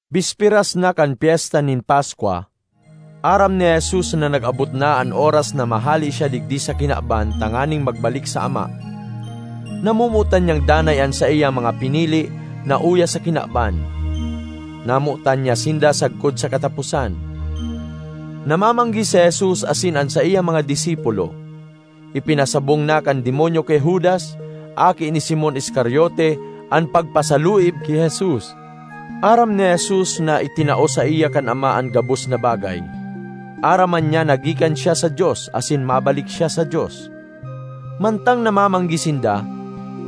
Bisperas na kan Pyesta nin Paskwa. Aram ni Jesus na nag-abot na an oras na mahale siya digdi sa kinaban tanganing magbalik sa Ama. Namomotan niyang danay an saiyang mga pinili na uya sa kinaban; namotan niya sinda sagkod sa kataposan. Namamanggi si Jesus asin an saiyang mga disipulo. Ipinasabong na kan demonyo ki Judas, aki ni Simon Iscariote, an pagpasaluib ki Jesus. Aram ni Jesus na itinao saiya kan Ama an gabos na bagay; aram man niya na gikan siya sa Dios asin mabalik siya sa Dios. Mantang namamanggi sinda,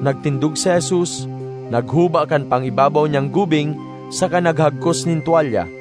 nagtindog si Jesus, naghuba kan pang-ibabaw niyang gubing saka naghagkos nin twalya.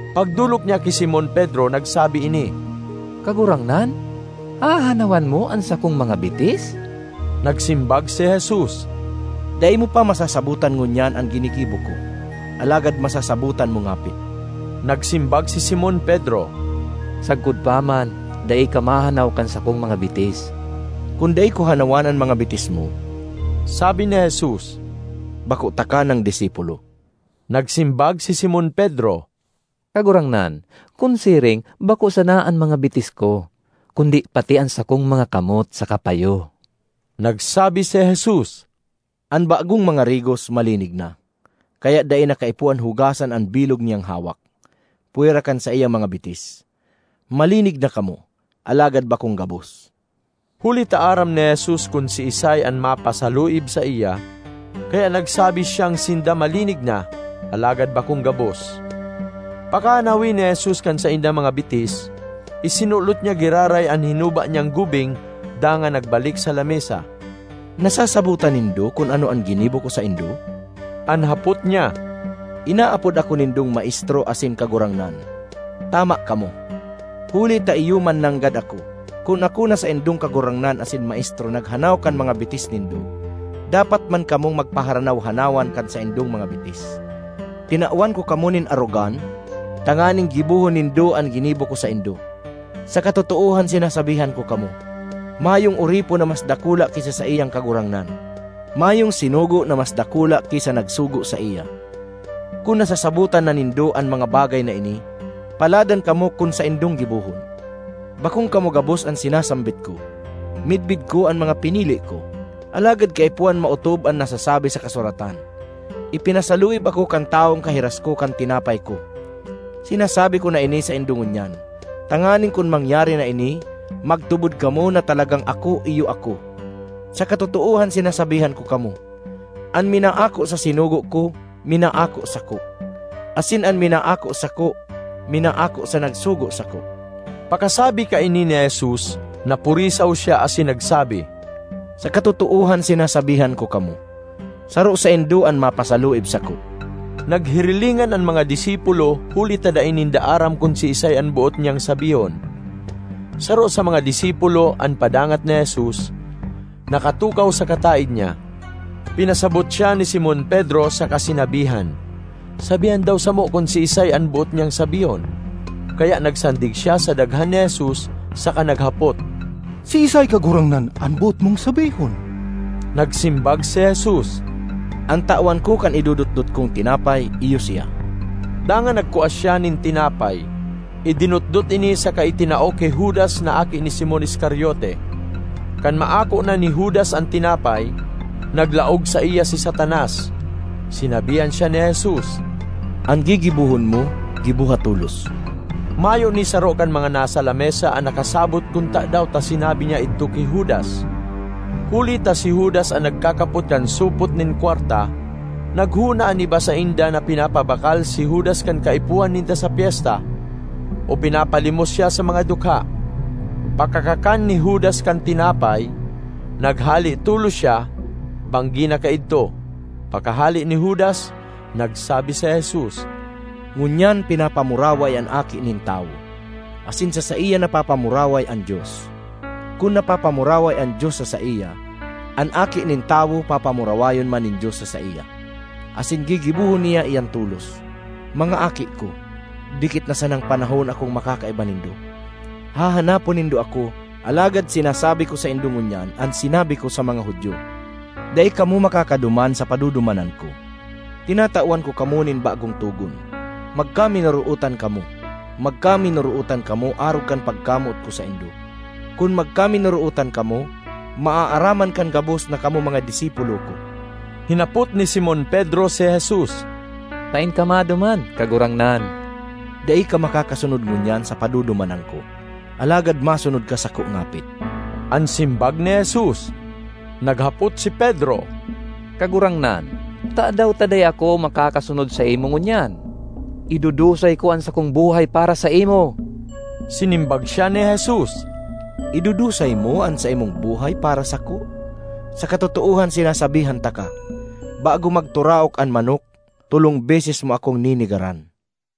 Pagdolok niya ki Simon Pedro, nagsabi ini, “Kagurangnan, hahanawan mo an sakong mga bitis?” Nagsimbag si Jesus, “Dai mo pa masasabotan ngunyan an ginigibo ko, alagad masasabotan mo ngapit.” Nagsimbag si Simon Pedro, “Sagkod pa man dai ka mahanaw kan sakong mga bitis!” “Kun dai ko hanawan an mga bitis mo,” sabi ni Jesus, “Bako taka nang disipulo.” Nagsimbag si Simon Pedro, “Kagurangnan, kun siring bako sana an mga bitis ko, kundi pati an sakong mga kamot saka payo!” Nagsabi si Jesus, “An bagong mangarigos, malinig na, kaya dai na kaipuhan hugasan an bilog niyang hawak, pwera kan saiyang mga bitis. Malinig na kamo, alagad bakong gabos.” (Huli ta aram ni Jesus kun siisay an mapasaluib saiya; kaya nagsabi siyang sinda malinig na, alagad bakong gabos.) Pakahanawi ni Jesus kan saindang mga bitis, isinulot niya giraray an hinuba niyang gubing dangan nagbalik sa lamesa. “Nasasabotan nindo kun ano an ginibo ko saindo?” an hapot niya. ”Inaapod ako nindong Maestro asin Kagurangnan. Tama kamo, huli ta iyo man mananggad ako. Kun ako na saindong Kagurangnan asin Maestro naghanaw kan mga bitis nindo, dapat man kamong magpaharanaw-hanaw an kan saindong mga bitis. Tinawan ko kamo nin arogan, tanganing gibohon nindo an ginibo ko saindo. Sa katotoohan sinasabihan ko kamo, mayong oripon na mas dakula ki sa saiyang kagurangnan; mayong sinugo na mas dakula ki sa nagsugo saiya. Kun nasasabotan na nindo an mga bagay na ini, paladan kamo kan saindong gibohon. ”Bakong kamo gabos an sinasambit ko; midbid ko an mga pinili ko. Alagad kaipuhan maotob an nasasabi sa kasuratan, ‘Ipinasaluib ako kan tawong kahiras ko kan tinapay ko.’ Sinasabi ko na ini saindo ngunyan, tanganing kun mangyari na ini, magtubod kamo na talagang ‘Ako Iyo Ako’. Sa katotoohan sinasabihan ko kamo, an minaako sa sinugo ko, minaako sako; asin an minaako sako, minaako sa nagsugo sako.” Pakasabi kaini ni Jesus, napurisaw siya asin nagsabi, “Sa katotoohan sinasabihan ko kamo, saro saindo an mapasaluib sako.” Naghirilingan an mga disipulo huli ta dai ninda aram kun siisay an boot niyang sabihon. Saro sa mga disipulo, an padangat ni Jesus, nakatukaw sa kataed niya. Pinasabot siya ni Simon Pedro saka sinabihan, “Sabihan daw samo kun siisay an boot niyang sabihon.” Kaya nagsandig siya sa daghan ni Jesus saka naghapot, “Siisay, Kagurangnan, an boot mong sabihon?” Nagsimbag si Jesus, “An tawan ko kan idodotdot kong tinapay, iyo siya.” Dangan nagkua siya nin tinapay, idinotdot ini saka itinao ki Judas na aki ni Simon Iscariote. Kan maako na ni Judas an tinapay, naglaog saiya si Satanas. Sinabihan siya ni Jesus, “An gigibohon mo, giboha tolos!” Mayo ni saro kan mga nasa lamesa an nakasabot kun tadaw ta sinabi niya idto ki Judas. Huli ta si Judas an nagkakapot kan supot nin kwarta, naghona an iba sainda na pinapabakal si Judas kan kaipuhan ninda sa pyesta, o pinapalimos siya sa mga dukha. Pakakakan ni Judas kan tinapay, naghale tolos siya. Banggi na kaidto. Pakahale ni Judas, nagsabi si Jesus, “Ngunyan pinapamuraway an Aki nin Tawo, asin sa saiya napapamuraway an Dios. Kun napapamuraway an Dios sa saiya, an Aki nin Tawo papamurawayon man nin Dios sa saiya. Asin gigibohon niya iyan tolos. Mga aki ko, dikit na sanang panahon akong makakaiba nindo. Hahanapon nindo ako; alagad sinasabi ko saindo ngunyan an sinabi ko sa mga Judio, ‘Dai kamo makakaduman sa padudumanan ko.’ Tinatawan ko kamo nin bagong togon: magkaminorootan kamo. Magkaminorootan kamo arog kan pagkamoot ko saindo. Kun magkaminorootan kamo, maaaraman kan gabos na kamo mga disipulo ko.” Hinapot ni Simon Pedro si Jesus, “Saen ka maduman, Kagurangnan?” “Dai ka makakasunod ngunyan sa padudumanan ko, alagad masunod ka sako ngapit,” an simbag ni Jesus. Naghapot si Pedro, “Kagurangnan, tadaw ta dai ako makakasunod saimo ngunyan? Idudusay ko an sakong buhay para saimo!” Sinimbag siya ni Jesus, “Idudusay mo an saimong buhay para sako? Sa katotoohan sinasabihan taka, bago magturaok an manok, tolong beses mo akong nenegaran.”